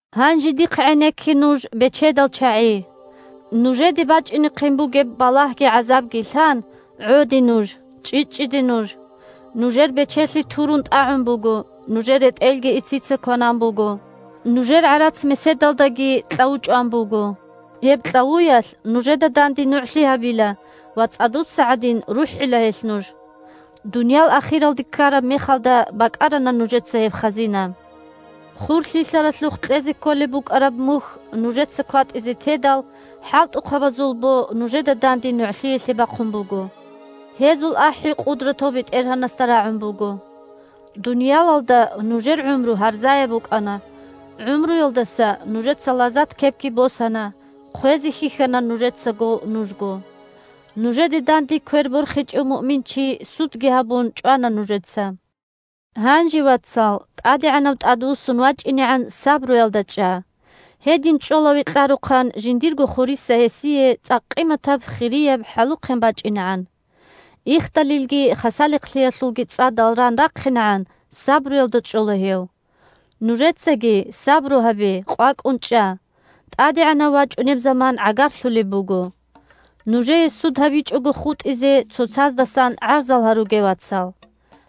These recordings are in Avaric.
Гьанже дихъ гӀенекке нуж, бечедал чагӀи! Нужеде бачӀинехъин бугеб балагьги-гӀазабги лъан, гӀоде нуж, чӀчӀичӀчӀиде нуж! Нужер бечелъи турун тӀагӀун буго, нужер ретӀелги ицица кванан буго. Нужер гӀарац-меседалдаги кьаву чӀван буго. Гьеб кьавуялъ нужеда данде нугӀлъи гьабила ва, цӀадуца гӀадин, рухӀила гьелъ нуж. Дуниял ахиралде ккараб мехалда бакӀарана нужеца гьеб хазина! Хур лъилъаралъухъ кьезе кколеб букӀараб мухь нужеца кватӀизе тедал, хӀалтӀухъабазул бо нужеда данде нугӀлъиялъе бахъун буго. Гьезул ахӀи Къудратав БетӀергьанасда рагӀун буго. Дуниялалда нужер гӀумру гьарзаяб букӀана, гӀумруялдаса нужеца лазат-кепги босана, – хъвезе хьихьана нужецаго нужго! Нужеде данде квер борхичӀев муъминчи, судги гьабун, чӀвана нужеца. Гьанже, вацал, ТӀадегӀанав тӀадвуссун вачӀинегӀан сабруялда чӀа. Гьедин чӀола векьарухъан жиндирго хуриса гьесие цӀакъ къиматаб-хирияб хӀалухъен бачӀинегӀан. Ихдалилги хасалихълъиялъулги цӀадал ран рахъинегӀан сабруялда чӀола гьев. Нужецаги сабру гьабе, къвакӀун чӀа, ТӀадегӀанав вачӀунеб заман гӀагарлъулеб буго. Нужее суд гьабичӀого хутӀизе цоцаздасан гӀарзал гьаруге, вацал.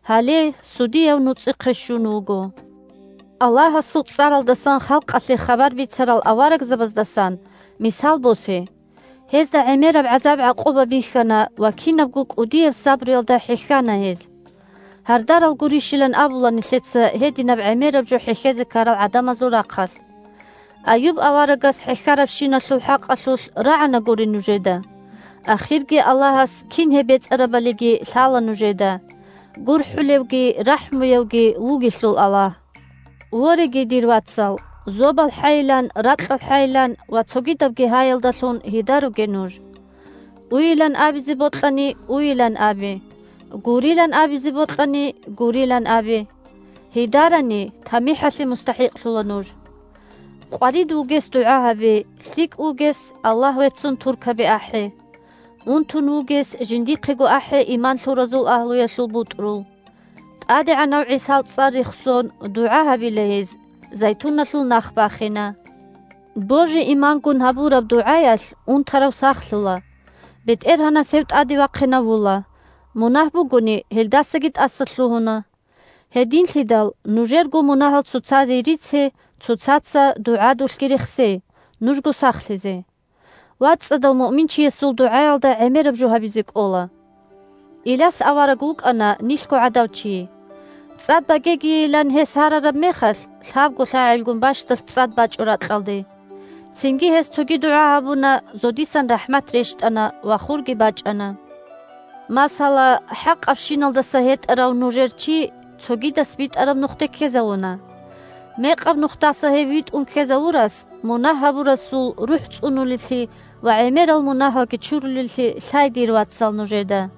Гьале, Судияв нуцӀихъе щун вуго! Аллагьасул цӀаралдасан халкъалъе хабар бицарал аварагзабаздасан мисал босе: гьезда гӀемераб гӀазаб-гӀакъуба бихьана ва кинабго кӀудияб сабруялда хӀехьана гьез. Гьардарал гурищилан абула нилъеца гьединаб гӀемераб жо хӀехьезе ккарал гӀадамазул рахъалъ. Аюб аварагас хӀехьарабщиналъул хӀакъалъулъ рагӀанагури нужеда, ахирги Аллагьас кин гьеб бецӀарабалиги лъала нужеда. ГурхӀулевги рахӀмуявги вугелъул Аллагь. Вореги, дир вацал, зобалхӀайилан, ракьалхӀайилан ва цогидабги гьаялдалъун гьедаруге нуж. Уйилан абизе бокьани, уйилан абе, гурилан абизе бокьани, гурилан абе. Гьедарани – тамихӀалъе мустахӀикълъула нуж. Къварид вугес дугӀа гьабе, лъикӀ вугес, Аллагь веццун туркаби ахӀе. Унтун вугес жиндихъего ахӀе иман лъуразул агьлуялъул бутӀрул. ТӀадегӀанав ГӀисал цӀар рехсон, дугӀа гьабила гьез, зайтуналъул нах бахина. Божи-имангун гьабураб дугӀаялъ унтарав сахлъула, БетӀергьанас гьев тӀаде вахъинавула, мунагь бугони, гьелдасаги тӀасалъугьуна. Гьединлъидал нужерго мунагьал цоцазе рице, цоцаца дугӀадулъги рехсе, нужго сахлъизе. ВацӀцӀадав муъминчиясул дугӀаялда гӀемераб жо гьабизе кӀола. Иляс авараг вукӀана нилъго гӀадав чи. ЦӀад багегийилан гьес гьарараб мехалъ, лъабго лъагӀелгун бащдалъ цӀад бачӀо ракьалде. Цинги гьес цоги дугӀа гьабуна, – зодисан рахӀмат рещтӀана ва хурги бачӀана. Масала, хӀакъабщиналдаса гьетӀарав нужер чи цогидас битӀараб нухде ккезавуна. Мекъаб нухдаса гьев витӀун ккезавурас мунагь гьабурасул рухӀ цӀунулеблъи ва гӀемерал мунагьалги чурулеллъи лъай, дир вацал, нужеда!